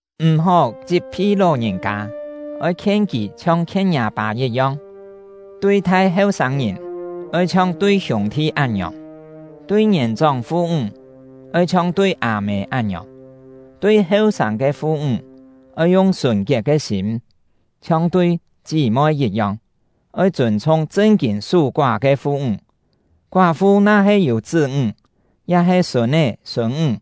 M̀-hó chit-phi ló-ngìn-kâ; oi khien kì chhiong khien ngiâ pâ yit-yong. Tui-thai heu-sâng-ngìn oi chhiong tui hiûng-thi án-ngiòng; tui ngièn-chóng fu-ńg oi chhiong tui â-mê án-ngiòng; tui heu-sâng ke fu-ńg oi yung sùn-kiet ke sîm, chhiong tui chí-moi yit-yong. Oi chûn-chhung chṳn-kîn sú-koá ke fu-ńg. Koá-fu na-he yû chṳ́-ńg ya-he sûn-é sûn-ńg,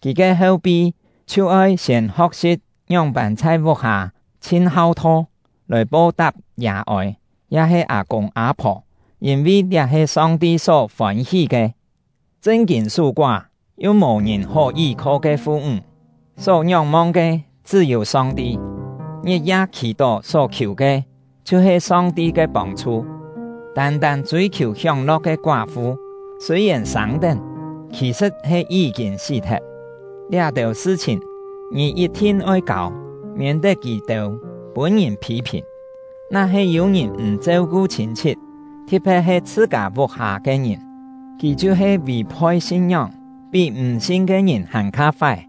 kì ke heu-pi chhiu-oi siên ho̍k-si̍p ngióng-pân chhai vuk-hâ chhin hau-tho, lòi po-tap yà-ôi ya-he â-kûng â-phò, yîn-vi liá he Song-ti só fôn-hí ke. Chṳn-kîn sú-koá yu mò-ngìn hó yí-kho ke fu-ńg, só ngióng-mong ke chṳ́-yû Song-ti, ngit-ya khì-tó só-khiù ke chhiu-he Song-ti ke pông-chhu. Tân-tân chûi-khiù hióng-lo̍k ke koá-fu, sûi-yèn sâng-tén, khì-sṳ̍t he yí-kîn sí-thet. Liá-têu sṳ-chhìn, ngì yit-thin oi kâu, miên-tet kì-têu pûn-ngìn phî-phìn. Na-he yû-ngìn m̀ cheu-ku chhîn-chhit, thi̍t-phe̍t he chhṳ-kâ vuk-hâ ke ngìn, kì chhiu-he vì-phoi sin-ngióng, pí m̀-sin ke ngìn hàn-kha fái.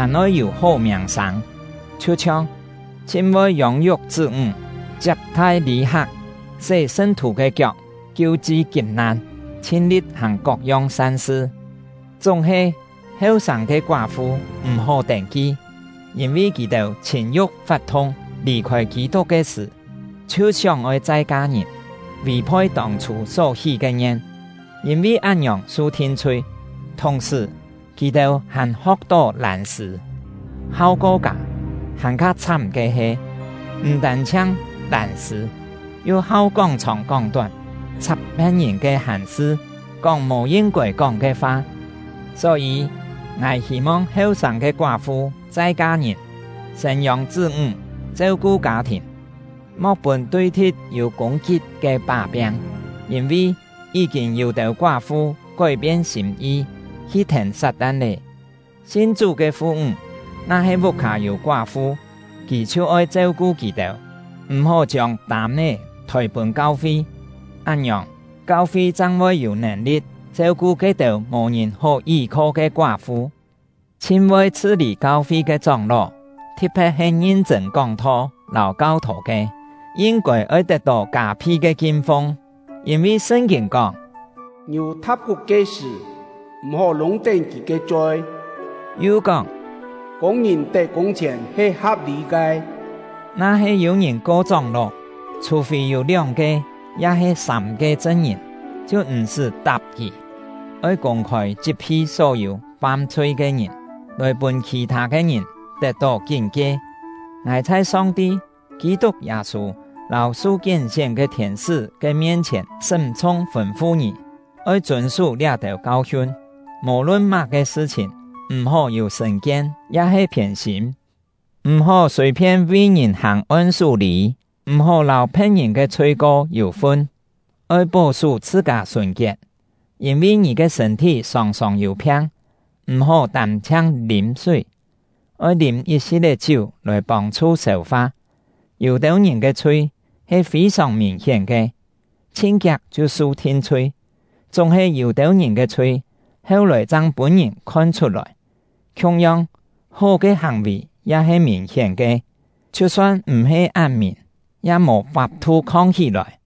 hàn oi yû hó miàng-sâng, chhiu-chhiong: Chhin voi yông-yuk chṳ́-ńg, chiap-thai lî-hak, sé sṳn-thù ke kiok, kiu-chi kip-nan, chhin-li̍t hàng kok-yong san-sṳ. Chúng-he, heu-sâng ke koá-fu m̀-hó tên-ki; yîn-vi kì-têu chhìn-yu̍k fat-thung, lì-khôi Kî-tuk ke sṳ̀, chhiu sióng-oi chai ka-ngìn, vì-phoi tông-chhû só-hí ke ngien, yîn-vi án-ngiòng su thin-chhui. Thùng-sṳ̀, kì-têu hàn ho̍k-tó lân-sṳ̂, hau ko kâ; hàn-kha chhám ke he, m̀ tân-chhiang lân-sṳ̂, yu hau kóng-chhòng kóng-tón, chhap phe̍t-ngìn ke hàn-sṳ, kóng mò yin-kôi kóng ke fa. Só-yî, ngài hî-mong heu-sâng ke koá-fu chai ka-ngìn, sên-yông chṳ́-ńg, cheu-ku kâ-thìn, mo̍k pûn tui-thi̍t yû kûng-kit ke pá-piang. Yîn-vi, yí-kîn yû-têu koá-fu kói-pien sîm-yi, hi thèn Sat-tan lé. Sin Chú ke fu-ńg na-he vuk-hâ yû koá-fu, kì chhiu oi cheu-ku kì-têu, m̀-hó chiông tâm-é thôi pûn kau-fi; án-ngiòng, kau-fi chang voi yû nèn-li̍t cheu-ku ke-têu mò-ngìn hó yí-kho ke koá-fu. Chhin voi chhṳ-lî kau-fi ke chóng-ló, thi̍t-phe̍t he ngin-chṳ̂n kóng-tho lâu kau-thô ke, yin-kôi oi tet-tó kâ-phi ke kin-fung. Yîn-vi Sṳn-kîn kóng: “Ngiù tha̍p kuk ke sṳ̀, m̀-hó lûng-tén kì ke choi”; yu kóng: “Kûng-ngìn tet kûng-chhièn he ha̍p-lî ke.” Na-he yû-ngìn ko chóng-ló, chhù-fî yû lióng-ke ya-he sâm-ke chṳn-ngìn, chhiu m̀-sṳ́ tap kì. Oi kûng-khôi chit-phi só-yû fam-chhui ke ngìn, lòi pûn khì-thâ ke ngìn tet-tó kín-kie. Ngài chhai Song-ti, Kî-tuk Yâ-sû, lâu su kién-sién ke thiên-sṳ́ ke mien-chhièn sṳ́m-chhung fûn-fu ngì, oi chûn-sú liá-têu kau-hiun, mò-lun má-ke sṳ-chhìn m̀-hó yû sṳ̀n-kien ya-he phiên-sîm. M̀-hó sùi-phien vi ngìn hàng on-sú-lî; m̀-hó lâu phe̍t-ngìn ke chhui-ko yû-fun; oi pó-sú chhṳ-kâ sùn-kiet. Yîn-vi ngì ke sṳ̂n-thí sòng-sòng yû phiang, m̀-hó tân-chhiang lîm súi, oi lîm yit-si̍t-é chiú lòi pông-chhu sêu-fa. Yû-têu ngìn ke chhui he fî-sòng mìn-hién ke, chhin kiak chhiu su thin-chhui; chúng-he, yû-têu ngìn ke chhui heu-lòi chang pûn-ngìn khon-chhut-lòi. Khiung-yong, hó ke hàng-vì ya he mìn-hién ke; chhiu-son m̀-he án mìn, ya mò fap-thu khong-hí-lòi.